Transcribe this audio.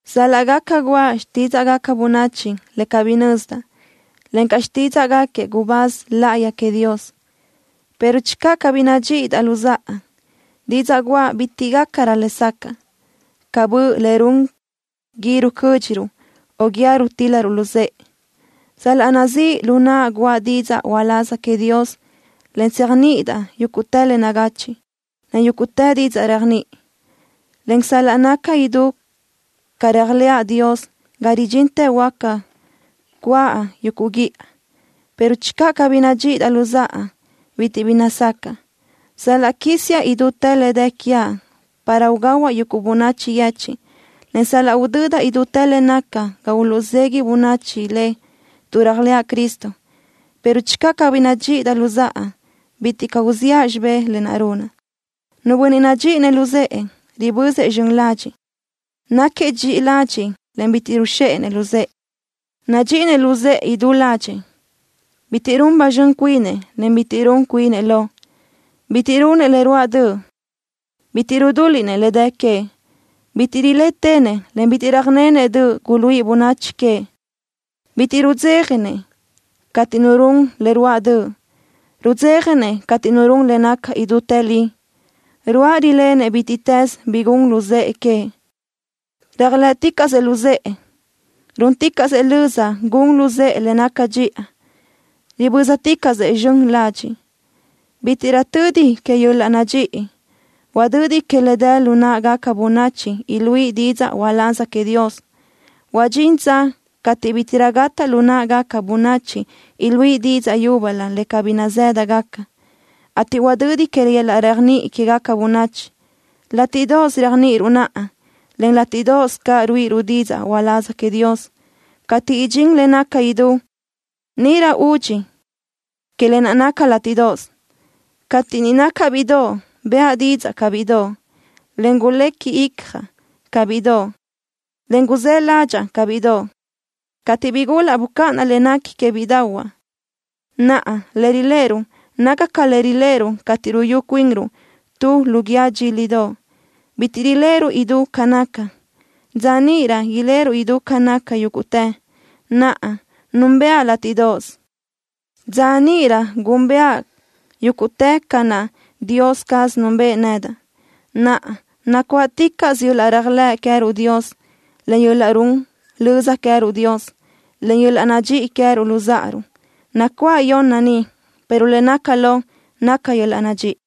Sal-laʼ gaca guʼa xtídzaʼgaca bönachi le cabí nazëdaʼ, encaʼ xtídzaʼgaquiëʼ gubáz láʼayi queëʼ Dios, pero channö cabí nadxíʼidaʼ luzáʼa, didzaʼ guʼa bitiʼ gácarö lesacaʼ ca bö le run gui rucö́dxiruʼ o guíë rutíl-laruʼ luzë́ʼe. Sal-laʼ nazíʼ lu naʼa guʼa didzaʼ uláz queëʼ Dios en tséajniʼidaʼ yúguʼtë le nagachiʼ, en yúguʼtë didzaʼ réajniʼi, en sal-laʼ naca idú ca réajlëʼa Dios ga ridxintë huáca cúaʼ yuguʼ guíʼa, pero channö cabí nadxíʼidaʼ luzáʼa, bitiʼ bi nazácaʼa. Sal-laʼ quísiaʼ idútë le dë quiaʼ para ugahuaʼ yuguʼ bönachi yechiʼ, en sal-laʼ udödaʼ idútë le nacaʼ ga uluʼzegui bönachi le tuʼ réajlëʼa Cristo, pero channö cabí nadxíʼidaʼ luzáʼa, bitiʼ caʼ uziʼa xibé lë naʼ runaʼ. Nu bönniʼ nadxíʼinëʼ luzë́ʼë, ribözëʼ zxön ladxiʼ. Náquiëʼ dxiʼi ladxiʼ, en bitiʼ ruzxéʼenëʼ luzë́ʼë. Nadxíʼinëʼ luzë́ʼë idú ládxëʼë. Bitiʼ run ba zxön cuinëʼ, en bitiʼ run cuinëʼ lo. Bitiʼ runëʼ le ruáʼ döʼ. Bitiʼ rudúliʼnëʼ le dë queëʼ. Bitiʼ rilétenëʼ, en bitiʼ röjnenëʼ döʼ guluíʼi bönachi queëʼ. Bitiʼ caʼ rudzéjanëʼ cateʼ nu run le ruáʼ döʼ. Rudzéjanëʼ cateʼ nu run le naca idútë li. Ruáʼ rilenëʼ bítiʼtës bi gun luzë́ʼë queëʼ. Réajlëʼticaʼsëʼ luzë́ʼë. Rúnticaʼsëʼ löza gun luzë́ʼë le naca dxiʼa. Ribö́zaticaʼsëʼ zxön ladxiʼ. Bítiʼrö tödi que yöl-laʼ nadxíʼi. Huadödi que le dë lu náʼagaca bönachi iluíʼi didzaʼ uláz queëʼ Dios. Huadxín dza cateʼ bítiʼrö gataʼ lu náʼagaca bönachi iluíʼi didzaʼ yúbölö le cabí nazë́dagaca, ateʼ huadödi que yöl-laʼ réajniʼi quéguequi bönachi. Látiʼdoʼos réajniʼiruʼ naʼa, en látiʼdoʼos caʼ ruíʼiruʼ didzaʼ uláz queëʼ Dios. Cateʼ idxín le naca idú, níʼirö údxi que lë naʼ naca látiʼdoʼos. Cateʼ niʼ nacaʼ bíʼidoʼ, bëʼa didzaʼ ca bíʼidoʼ, en gulequi icjaʼ ca bíʼidoʼ, en guzáʼ ládxaʼa ca bíʼidoʼ. Cateʼ bigulaʼ bucáʼanaʼ le nequi que bíʼidaʼahuaʼ. Naʼa le riléʼeruʼ naca ca le riléʼeruʼ cateʼ ruyú cuinruʼ tu lu guíë dxílidoʼ. Bitiʼ riléʼeruʼ idú ca naca. Dza níʼirö iléʼeruʼ idú ca naca yúguʼtë. Naʼa núnbëʼa látiʼdoʼos. Dza níʼirö gúnbëʼa yúguʼtë ca naʼ Dios caz núnbëʼë nedaʼ. Naʼa, nacuáʼticaʼsö yöl-laʼ réajlëʼ queë́ruʼ Dios, en yöl-laʼ run löza queë́ruʼ Dios, en yöl-laʼ nadxíʼi queë́ruʼ luzáʼaruʼ. Nacuáʼ yonna ni, pero le naca lo naca yöl-laʼ nadxíʼi.